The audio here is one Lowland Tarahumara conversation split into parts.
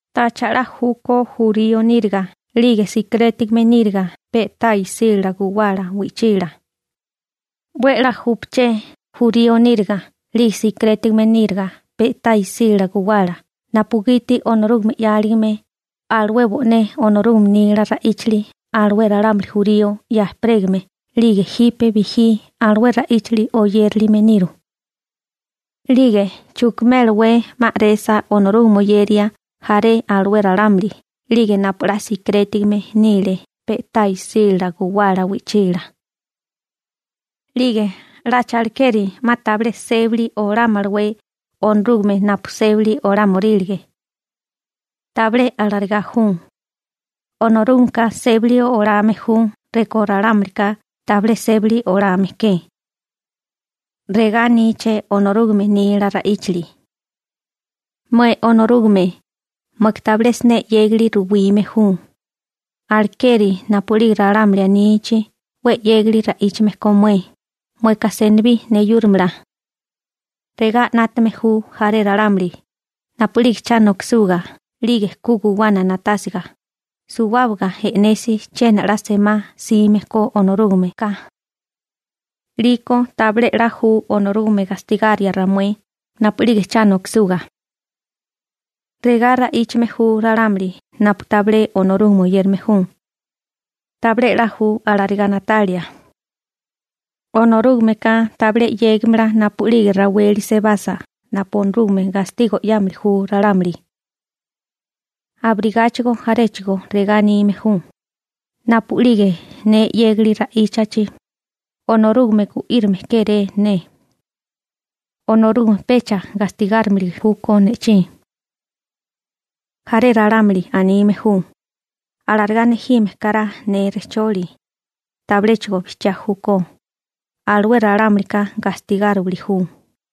¿Tacha 'la júkó jurío níriga 'lige sikerétigame níriga pe'tá isílala guwala wi'chila? 'We 'la júpaché jurío níriga 'lige sikirétigame níriga pe'tá isílala guwala napugiti Onorúgame 'yáligame alué bo'né Onorúgame nila ra'íchali alué ralámuli jurío 'ya ejperégame 'lige jipe bijí alué ra'íchali oyérilime niru. 'Lige ¿chukimélawé 'ma a'resa Onorúgame oyeria jaré alué ralámuli 'lige napu 'la sikirétigame nile pe'tá isílala guwala wi'chila? ¿'Lige 'lacha alekeri 'ma tabilé sébili olámalawé Onorúgame napu sébili olámorílige? Tabilé alarigá ju, Onorúgameka sébili olame ju rekó ralámulika tabilé sébili olame ke. Regá aníché Onorúgame nila ra'íchali: Mué Onorúgame, mueka tabilé siné 'yégali ruwime ju, alekeri napu'lige ralámuli anichi 'we 'yégali ra'íchame ko mué, mueka senibí neyúrimala. Regá 'nátame ju jaré ralámuli: «Napu'lige cha nokisuga 'lige ku guwana na'tásiga, suwábaga e'nesi chiena 'la semá 'sime ko Onorúgame ka. 'Liko tabilé 'la ju Onorúgame gastigaria ramué napu'lige cha nokisuga.›› (Regá ra'íchame ju ralámuli napu tabilé Onorúgame oyérame ju.) Tabilé 'la ju alarigá na'talia. Onorúgameka tabilé 'yégimala napu'lige raweli sebasa napu Onorúgame gastigo 'yámili ju ralámuli. Abirigáchigo jaréchigo regá anime ju: «Napu'lige ne 'yégali ra'íchachi, Onorúgame gu'írame kéré ne. Onorúgame pecha gastigáromili júkó ne'chí.» Jaré ralámuli anime ju, alarigá nejime kará ne rejcholi, tabiléchigo bijchiá júkó, alué ralámulika gastigáriwili ju.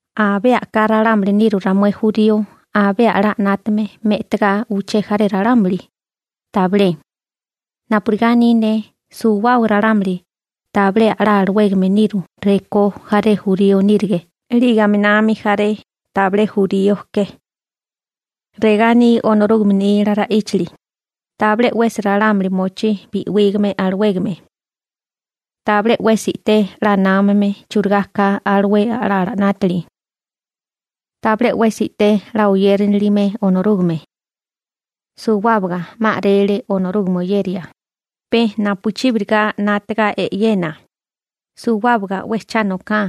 ¿Abé a'ká ralámuli niru ramué jurío abé a'lá 'nátame me'tagá uché jaré ralámuli? Tabilé. Napurigá aní ne, suwábaga ralámuli tabilé a'lá alawégame niru rekó jaré jurío nírige 'lige aminami jaré tabilé jurío ke. Regá aní Onorúgame nila ra'íchali: Tabilé 'wesi ralámuli mochí bi'wígame alawégame. Tabilé 'wesi i'té 'la námame churigá ka alué a'lala 'nátili. Tabilé 'wesi i'té 'la oyérinilime Onorúgame. Suwábaga 'ma a'rele Onorúgame oyeria, pe napuchíbiriga 'nátaga e'yena, suwábaga 'we cha noká.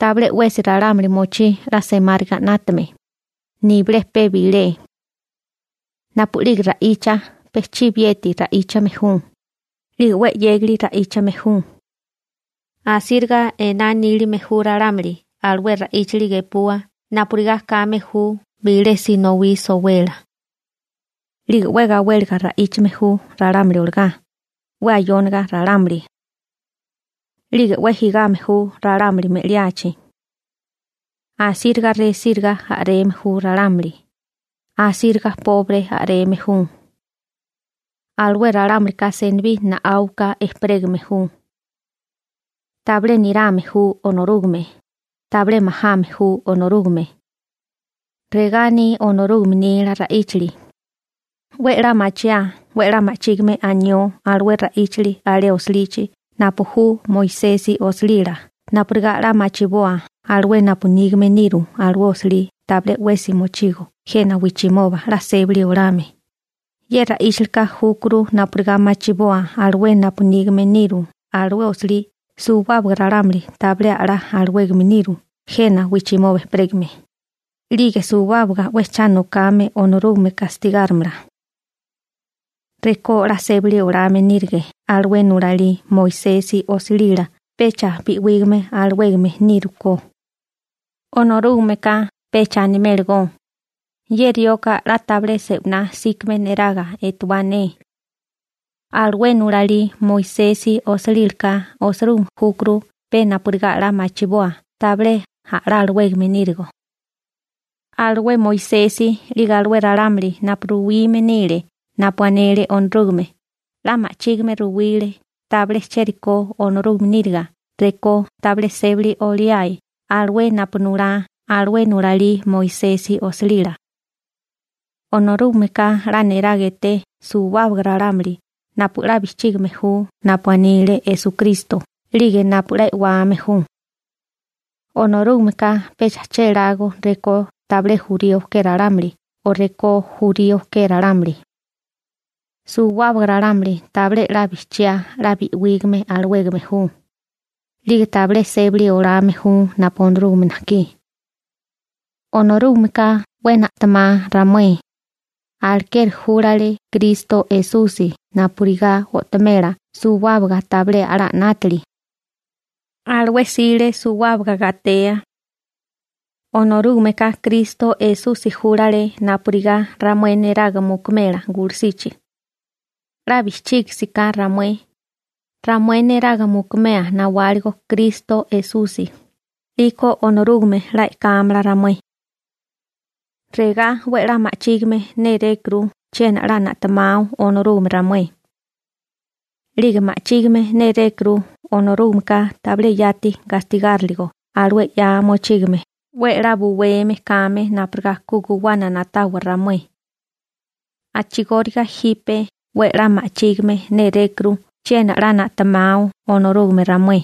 Tabilé 'wesi ralámuli mochí 'la semáriga 'nátame, nibilé pe bilé. Napu'lige ra'icha pe chibiyeti ra'íchame ju, 'lige 'we 'yégali ra'íchame ju. Asíriga ená nílime ju ralámuli alué ra'íchali gepua napurigá kame ju bilé sinowí sowelá. 'Lige 'we gawéliga ra'íchame ju ralámuli olagá, 'we ayóniga ralámuli. 'Lige 'we jigame ju ralámuli me'liachi. Asíriga resíriga a'reme ju ralámuli, asíriga pobre a'reme ju. Alué ralámulika senibí na'áuka ejperégame ju. Tabilé nirame ju Onorúgame, tabilé majame ju Onorúgame. Regá aní Onorúgame nila ra'íchali. 'We 'la machiaa 'we 'la ma'chígime anió alué ra'íchali alé osilichi napu ju Moisesi osilila napurigá 'la machiboa alué napu nígame niru alué osilí tabilé 'wesi mochigo jena wijchimoba 'la sébali olame, ye ra'íchalika júkuru napurigá machiboa alué napu nígame niru alué osilí suwábaga ralámuli tabilé a'lá alawégame niru jena wijchimoba ejperégame, 'lige suwábaga 'we cha nokame Onorúgame gastigárimala. Rekó 'la sébali olame nírige alué nulalí Moisesi osilila pecha bi'wígame alawégame nírukó. Onorúgameka pecha animélagó: «Ye rioka 'la tabilé se'winá 'síkame neraga etewá ne.» Alué nulalí Moisesi osilílaka osirúgime júkuru pe napurigá 'la machiboa tabilé a'lá alawégame nírigo. Alué Moisesi 'lige alué ralámuli napu ruwime nile napu anele Onorúgame 'la ma'chígime ruwile tabilé chérikó Onorúgame níriga rekó tabilé sébali oliae alué napu nulá alué nulalí Moisesi osilila. Onorúgameka 'la niraga eté suwábaga ralámuli napu 'la bijchígime ju napu anile Esukristo 'lige napu 'la e'wame ju. Onorúgameka pecha chélágó rekó tabilé jurío ke ralámuli o rekó jurío ke ralámuli. Suwábaga ralámuli tabilé 'la bijchiá 'la bi'wígame alawégame ju, 'lige tabilé sébali olame ju napu Onorúgame najkí. Onorúgameka 'we na'temá ramué, alekeri júlale Kristo Esusi napurigá o'tomela suwábaga tabilé a'lá 'nátili (pecado). Alué 'sile suwábaga gatea. Onorúgameka Kristo Esusi júlale napurigá ramué neraga mukumela gulusichi. 'La bijchígisiká ramué, ramué neraga mukumea nawáligo Kristo Esusi 'liko Onorúgame 'la e'kámala ramué. Regá 'we 'la ma'chígime nérékuru chiena 'la na'tamao Onorúgame ramué. 'Lige ma'chígime nélékuru Onorúgameka tabilé yati gastigáriligo alué 'ya mochígame napugiti Onorúgameka 'we 'la buweme kame napurigá ku guwana na'tawa ramué. A'chigóriga jipe 'we 'la ma'chígime nérékuru chiena 'la na'temao Onorúgame ramué.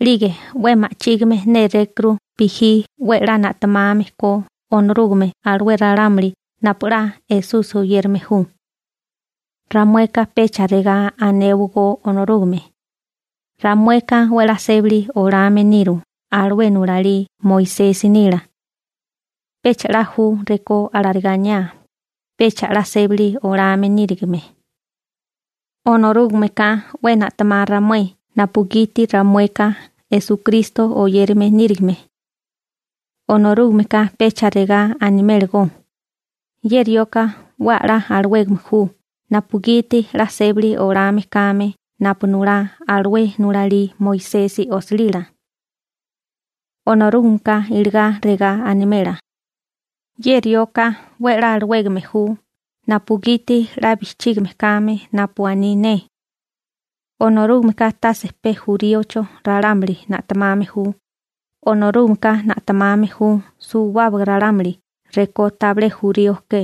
'Lige 'we ma'chígime nérékuru bijí 'we 'la na'tamame ko Onorúgame alué ralámuli napu 'la Esusi oyérame ju. Ramueka pecha regá anéwagó Onorúgame: «Ramueka 'we 'la sébali olame niru alué nulalí Moisesi nila.» Pecha 'la ju rekó alarigá aniá, pecha 'la sébali olame nírigime. Onorúgameka 'we na'temá ramué napugiti ramueka Esukristo oyérame nírigime. Onorúgameka pecha regá animélagó: «Ye rioka 'we a'lá alawégame ju napugiti 'la sébali olame kame napu nulá alué nulalí Moisesi osilila.» Onorúgameka iligá regá animela: «Ye rioka 'we a'lá alawégame ju napugiti 'la bijchígime kame napu aní ne.» Onorúgameka tase pe juríocho ralámuli na'temame ju, Onorúgameka na'temame ju suwábaga ralámuli rekó tabilé jurío ke.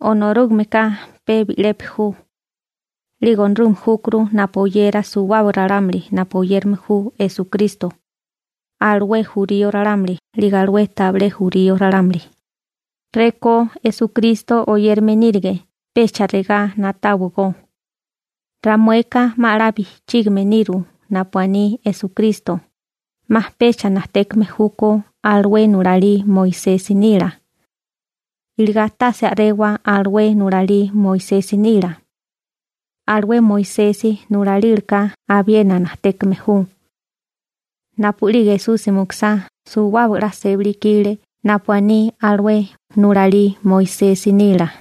Onorúgameka pe bi'lepi ju, 'lige Onorúgame júkuru napu oyera suwábaga ralámuli napu oyérame ju Esukristo, alué jurío ralámuli 'lige alué tabilé jurío ralámuli. Rekó Esukristo oyérame nírige pecha regá na'táwagó: «Ramueka 'ma 'la bijchígime niru napu aní Esukristo, 'ma pecha najtékame júkó alué nulalí Moisesi nila.» Iligá tase a'rewa alué nulalí Moisesi nila. Alué Moisesi nulalílaka abiena najtékame ju. Napu'lige Esusi mukusá suwábaga 'la sébali ikile napu aní alué nulalí Moisesi nila.